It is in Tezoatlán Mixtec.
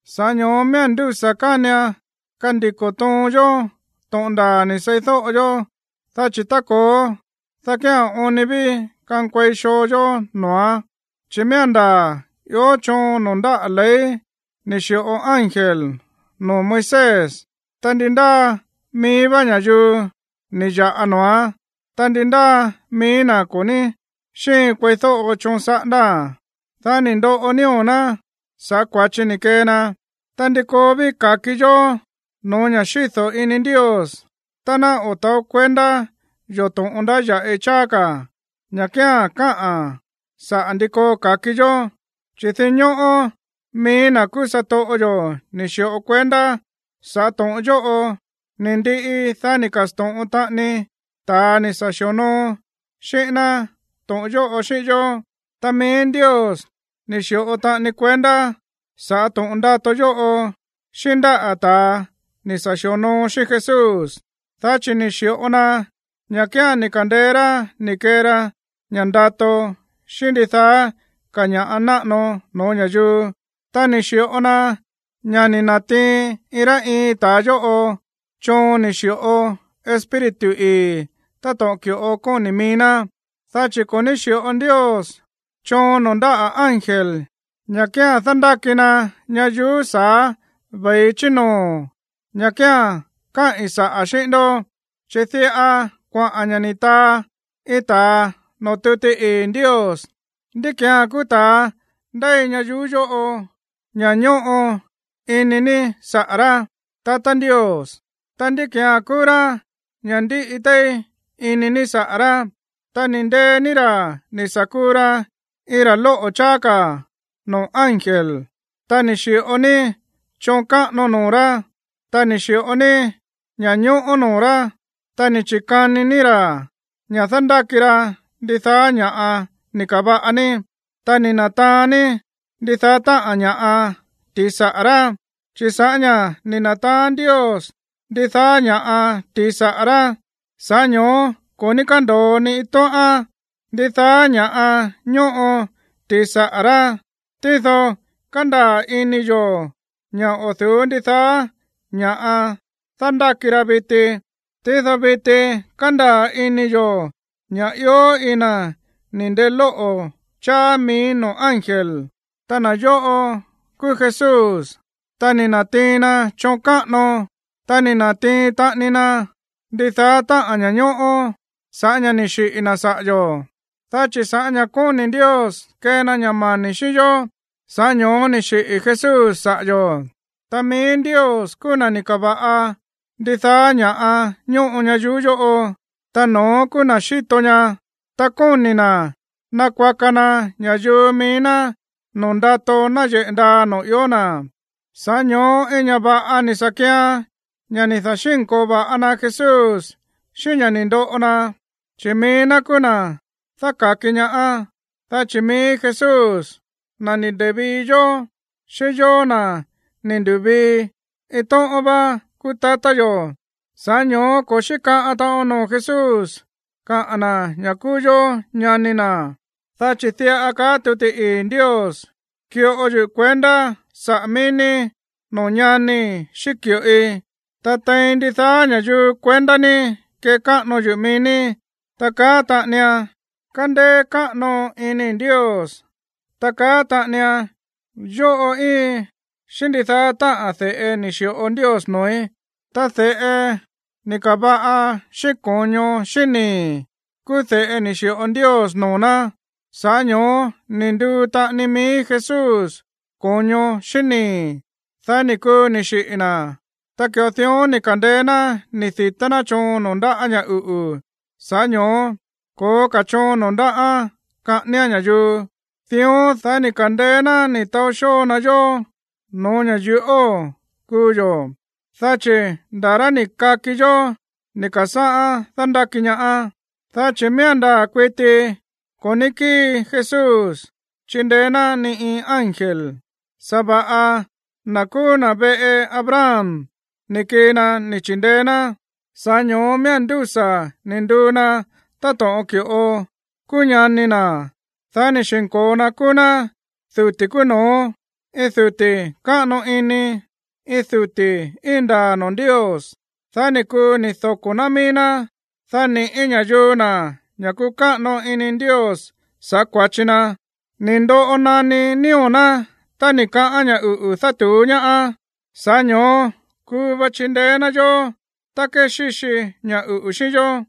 Sa̱ꞌá ño̱ó miía̱n ndúsa̱ kánian kandiko̱ toon yó to̱ꞌon ndaa̱ ni̱ seídóꞌo yó, dá chi̱ tá ko̱ó, dá kía̱n oon ni ví kankuei xoo yó noo̱án. Chi̱ miía̱n ndaa̱ ió choon noo̱ ndáꞌa̱ ley ni̱ xi̱ꞌo ángel noo̱ Moisés, ta ndi ndáa mií vá ña̱yuu ni̱ ya̱ꞌa noo̱án, ta ndi ndáa mií ná ko̱ ní xíin kueídóꞌo choon saꞌándáa̱n, dá ni̱ ndoꞌo nío̱ ná sa̱ꞌá kua̱chi ni̱ kee na. Ta, ¿ndi koo ví ka̱ki yó no̱ó ña̱ xído̱ ini Ndios tá ná o̱ ta̱ó kuendá yo̱ to̱ꞌon ndáya̱ꞌi cháá ka̱, ña̱ kía̱n káꞌa̱n saꞌa̱ ndi koo ka̱ki yó? Chi̱ dinñóꞌó mií na̱ kúú satoꞌo yo̱ ni̱ xi̱ꞌo kuendá sa̱ꞌá to̱ꞌon yóꞌo, ni̱ ndiꞌi, dá ni̱ ka̱sto̱ꞌon taꞌani ta̱a ni̱ sa̱ xi̱onoo xíꞌín ná to̱ꞌon yóꞌo xíꞌín yó. Ta mií Ndios ni̱ xi̱ꞌo taꞌani kuendá sa̱ꞌá to̱ꞌon ndato yóꞌo xíꞌín ndáꞌa̱ ta̱a ni̱ sa̱ xi̱onoo xíꞌín Jesús, dá chi̱ ni̱ xi̱ꞌo na ña̱ kía̱n ni̱ ka̱ndeé rá ni̱ kee ra ña̱ꞌa ndato xíꞌín ndidaá ka̱ ña̱ꞌa náꞌano no̱ó ña̱yuu, ta ni̱ xi̱ꞌo na ña̱ ni̱ na̱tiin iin rá iin ta̱a yóꞌo choon ni̱ xi̱ꞌo Espíritu ii̱ táto̱ꞌon ki̱ꞌo kóni̱ mií ná. Dá chi̱ ko̱ ní xi̱ꞌo Ndios choon noo̱ ndáꞌa̱ ángel ña̱ kía̱n dándáki na ñayuú sa̱á ve̱i chí noo̱, ña̱ kía̱n káꞌi̱n saꞌa̱ xíꞌín ndó. Dá chi̱ diꞌa kuaꞌa̱n ña̱ ni̱ taa iin ta̱a noo̱ tuti ii̱ Ndios: ¿Ndí ki̱án kúú ta̱a ndéi ñayuú yóꞌo ña̱ ñóꞌo ini ní saꞌa̱ rá, tatá Ndios? Ta, ¿ndí ki̱án kúú rá ña̱ ndíꞌi téí ini ní saꞌa̱ rá? Ta ni̱ ndee ní ra̱ sa̱ kuu ra iin ra̱ lóꞌo̱ cháá noo̱ ángel, ta ni̱ xi̱ꞌo ní choon káꞌano noo̱ rá, ta ni̱ xi̱ꞌo ní ña̱ñóꞌó noo̱ rá, ta ni̱ chi̱kani ní ra̱ ña̱ dándáki ra ndidaá ña̱ꞌa ni̱ ka̱va̱ꞌa ní, ta ni̱ na̱taán ní ndidaá táꞌa̱n ña̱ꞌa ti̱i saꞌa̱ rá. Chi̱ sa̱ꞌá ña̱ ni̱ na̱taán Ndios ndidaá ña̱ꞌa ti̱i saꞌa̱ rá, sa̱ꞌá ño̱ó ko̱ ní kándo̱o ni iin tóꞌán, ndidaá ña̱ ñóꞌo ti̱i saꞌa̱ rá, tído kándaa̱ ini yo̱ ña̱ o̱ du̱ú ndidaá ña̱ꞌa dándáki ra viti. Tído viti kándaa̱ ini yo̱ ña̱ ió iin na̱ ni̱ ndelóꞌo̱ cháá mií noo̱ ángel, ta na̱ yóꞌo kúú Jesús, ta ni̱ na̱tiin na choon káꞌano, ta ni̱ na̱tiin taꞌani na ndidaá táꞌa̱n ña̱ñóꞌó sa̱ꞌá ña̱ ni̱ xiꞌi̱ na̱ saꞌa̱ yo̱. Dá chi̱ sa̱ꞌá ña̱ kóni̱ Ndios kee na ña̱ mani̱ xíꞌín yó, sa̱ꞌá ño̱ó ni̱ xiꞌi̱ Jesús saꞌa̱ yo̱. Ta mií Ndios kúú na̱ ni̱ ka̱va̱ꞌa ndidaá ña̱ꞌa ñóꞌo ña̱yuu yóꞌo, ta no̱ón kúú na̱ xíto ñaá, ta kóni̱ na̱ nakuaka na ña̱yuu mií ná noo̱ ndato náyeꞌe̱ ndaa noo̱ ió na̱. Sa̱ꞌá ño̱ó iin ña̱ va̱ꞌa ni̱ sa̱ kian ña̱ ni̱ da̱xínko̱o va̱ꞌa na Jesús xíꞌín ña̱ ni̱ ndoꞌo na, chi̱ mií ná kúú na̱ dáka̱ki ñaá. Dá chi̱ mií Jesús, na̱ ni̱ nde̱vii yó, xíꞌín yóó, na̱ ni̱ ndu̱vii, iin tóꞌón vá kúú tatá yo̱, sa̱ꞌá ño̱ó ko̱ xíkaꞌan taꞌon noo̱ Jesús káꞌa̱n na̱ ña̱ kúú yó ñani na̱. Dá chi̱ diꞌa kaá tuti ii̱ Ndios: Ki̱ꞌo yuꞌu̱ kuendá saꞌa̱ mií ní noo̱ ñanii̱ xíꞌín ki̱ꞌoi, ta tein ndidaá ña̱yuu kuendá ní kekáꞌano yuꞌu̱ mií ní. Ta kaá taꞌanian: Kandeé káꞌano iníi̱ Ndios. Ta kaá taꞌanian: Yóꞌo íiin xíꞌín ndidaá táꞌa̱n de̱ꞌe ni̱ xi̱ꞌo Ndios noo̱í. Ta de̱ꞌe ni̱ ka̱va̱ꞌa xíꞌín ko̱ño xíꞌín nii̱ kúú de̱ꞌe ni̱ xi̱ꞌo Ndios noo̱ ná, sa̱ꞌá ño̱ó ni̱ nduu taꞌani mií Jesús ko̱ño xíꞌín nii̱, dá ni̱ kuu ni̱ xiꞌi̱ na̱. Ta ki̱ꞌo dión ni̱ ka̱ndeé ná ni̱ di̱tá ná choon noo̱ ndáꞌa̱ ña̱ uꞌu̱, sa̱ꞌá ño̱ó ko̱ó ka̱ choon noo̱ ndáꞌán kaꞌáníán ña̱yuu. Dión, dá ni̱ ka̱ndeé ná ni̱ taó xóo na yó no̱ó ña̱ yuꞌóo̱ kuu yo̱, dá chi̱ nda̱ rá ni̱ kaki yó ni̱ ka̱sáꞌá dándáki ñaá. Dá chi̱ miía̱n ndaa̱ kuiti ko̱ ní kíi Jesús chindeé ná ni iin ángel, sa̱va̱ꞌa na̱ kúú na̱ veꞌe Abraham ni̱ kii na ni̱ chi̱ndeé ná. Sa̱ꞌá ño̱ó miía̱n ndúsa̱ ni̱ nduu na táto̱ꞌon ki̱ꞌo kúú ñani na̱, dá ni̱ xi̱nko̱o na kúú ná duti̱ kúú no̱ó, iin duti̱ káꞌano ini, iin duti̱ íin ndaa̱ noo̱ Ndios, dá ni̱ kuu ni̱ doko̱ ná mií ná, dá ni̱ꞌí ña̱yuu na̱ ña̱ kuꞌu̱ káꞌano ini Ndios sa̱ꞌá kua̱chi na. Ni̱ ndoꞌo naní nío̱ ná tá ni̱ kaꞌán ña̱ uꞌu̱ dátu̱ú ñaáán, sa̱ꞌá ño̱ó kuu va chindeé ná yó tá kéxíxi ña̱ uꞌu̱ xíꞌín yó.